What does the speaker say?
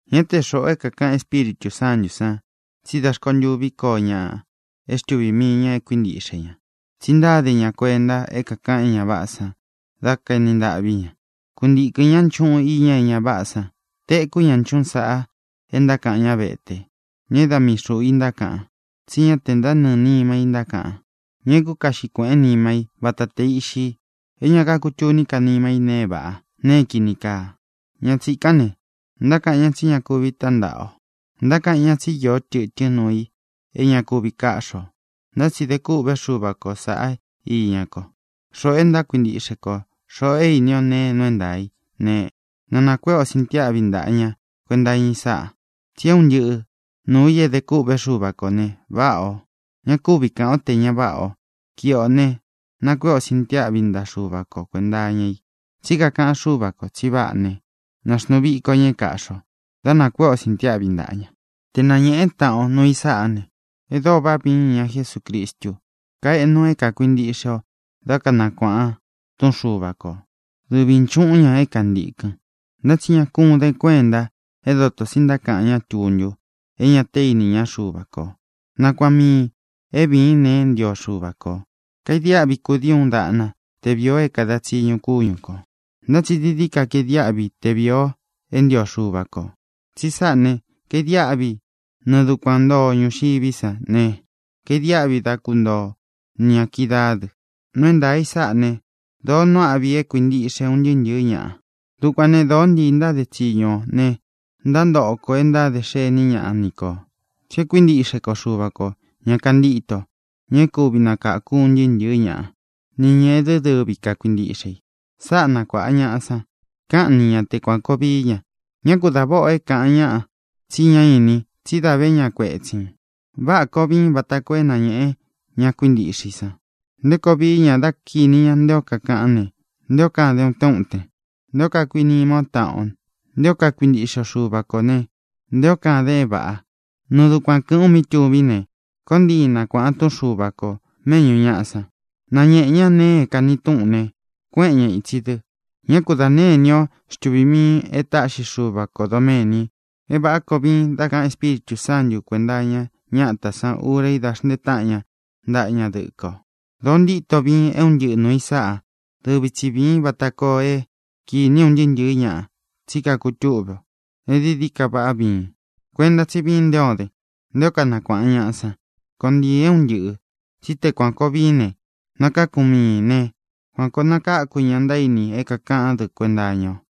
Ñá te xūꞌu o é kākaꞌan Espíritū Sántū san tsí da rkontuví koo ñaꞌa é xtuvī mii ña é kuīntiꞌxe ña, tsi ntáde ña kuenta é kākaꞌan é ña váꞌā san dá kaeni ntaꞌví ña. Kuntīkɨn ñá nchuꞌun iña é ña váꞌā san. Tekú ña nchúꞌun sāꞌa é ntákaꞌan ñá vete, ña é da mii xūꞌu i ntákaꞌan, tsí ña te ntánɨɨ̄ nima i ntákaꞌan, ña é kukaꞌxi kuēꞌén nima í vata tē iꞌxi, é ña kakutuní ka nima í nēe é vāꞌá, nēe é kīni kaa. Ña tsīkán ne, ntákaꞌan ñá tsi ña kuvi tántaꞌa ō. Ntákaꞌan ñá tsi íō tɨtɨ́n nuu i é ña kuvi káꞌxi ō. Ntá tsi de kûꞌvé Xuva kō saꞌá iña ko. Xoꞌō e ntákuintiꞌxe ko, xoꞌō é īni ó nēe é nuu é ntaā í ne, na nākuéꞌe ō sintiáꞌvi ntaꞌa ña kuenta iña i sáꞌa. Tsi é un ntɨꞌɨ nuū i é edé kûꞌvé Xuva kō ne, váꞌā o. Ña kúvi kāꞌan ó te ña váꞌa ō. Kiꞌi ō ne, nakuéꞌe ō sintiáꞌvi ntaꞌa Xuva ko kuēnta iña i. Tsí kakaꞌan Xúva kō tsi váꞌa ne, nāxnuu viko ña é kāꞌxi o da nakuéꞌe ō sintiáꞌvi ntaꞌa ña. Te nañēꞌen táꞌan o nuu i sáꞌā ne, é dōo váꞌa viin iña Jesúcristu. Kaeꞌnu é kākuintiꞌxe o dá kanakuāꞌan túꞌun Xuva ko, dɨvī nchuꞌun ña é kantīkɨn. Ntá tsi ña kún den kuenta é dotō tsi ntákaꞌan ñá tuntu, é ñā te íña Xuva ko. Nakuaꞌan miīn é vīín nēe é ntio Xuva kō. Kaidiáꞌvi kudii uun daꞌna te vīi o é kāda tsiñu kúñu kō, ntá tsi dií dií ka kaidiáꞌvi te vīi o é ntio Xuva kō. Tsi sáꞌā ne, kaidiáꞌvi nɨɨ dukuan ntoo o ñūxiví sa ne, kaidiáꞌvi dá kuntoo o ni ñā kídaā dɨ. Nuu é ntaā í sáꞌa ne, dōó nuu áꞌvi é kuīntiꞌxe un ntɨɨ́ ntɨ̄ɨ́ ñaꞌa. Dukuān ne, dóo ntii ntáde tsiñu ō ne, ntántoꞌo kō e ntádē xení ñaꞌa ni kō, tsí e kuíntiꞌxe ko Xuva kō, ña kantíto, ña é kuvi nakāku un ntɨɨ́ ntɨ̄ɨ́ ñaꞌa, nī ña é dɨ dɨvi kakuintiꞌxe i. Sáꞌa nakuāꞌan ñaꞌa san. Káꞌan ni ña te kuān koo vií ña. Ñá ku dā váꞌa o é kāꞌan ñáꞌa tsi ñá inin tsí dā vé ña kuetsīn. Váꞌā koo viin vata koo é nañēꞌen ña kuíntiꞌxe i san nté koo vií ña dá kinī ña nté o kakaꞌán ne, nté o kaden utén uten, nté o kakuīnima o táꞌan o, nté o kakuintiꞌxe o Xuva kō ne, nté o kaden é vāꞌa. Nɨɨ dukuan kɨ̄ꞌɨ́n u mí tuvín ne, koon ntiin nakuāꞌan túꞌun Xuva ko mēꞌñú ñaꞌa san, nañēꞌen ñá nēe é kāni túꞌun ne, kuéꞌen ñā itsi dɨ. Ñá ku dā née inī ó xtuvīn miin e táꞌxi Xuva kō doméni é vāꞌá koo viin dá kaꞌan Espíritū Sántu kuēnta iña ñátā sán ura í da xntee táꞌan ña ntaꞌa ña dɨkɨ o. Dōo ntíto viin é un ntɨꞌɨ nuū i sáꞌa. Dɨvi tsi vīin vata koo é kīni un ntɨɨ́ ntɨ̄ɨ́ ñaꞌa tsí kakutúꞌve o e dií dií ka váꞌa viin. Kuenta tsí viin nté o den, nté o kanakuāꞌan ñaꞌa san. Koon ntiin é un ntɨꞌɨ̄. Tsí te kuān koo viín ne, nakākún miin ne, kuan koo nakākún ña ntaíni é kākaꞌán dɨ kuenta iña o.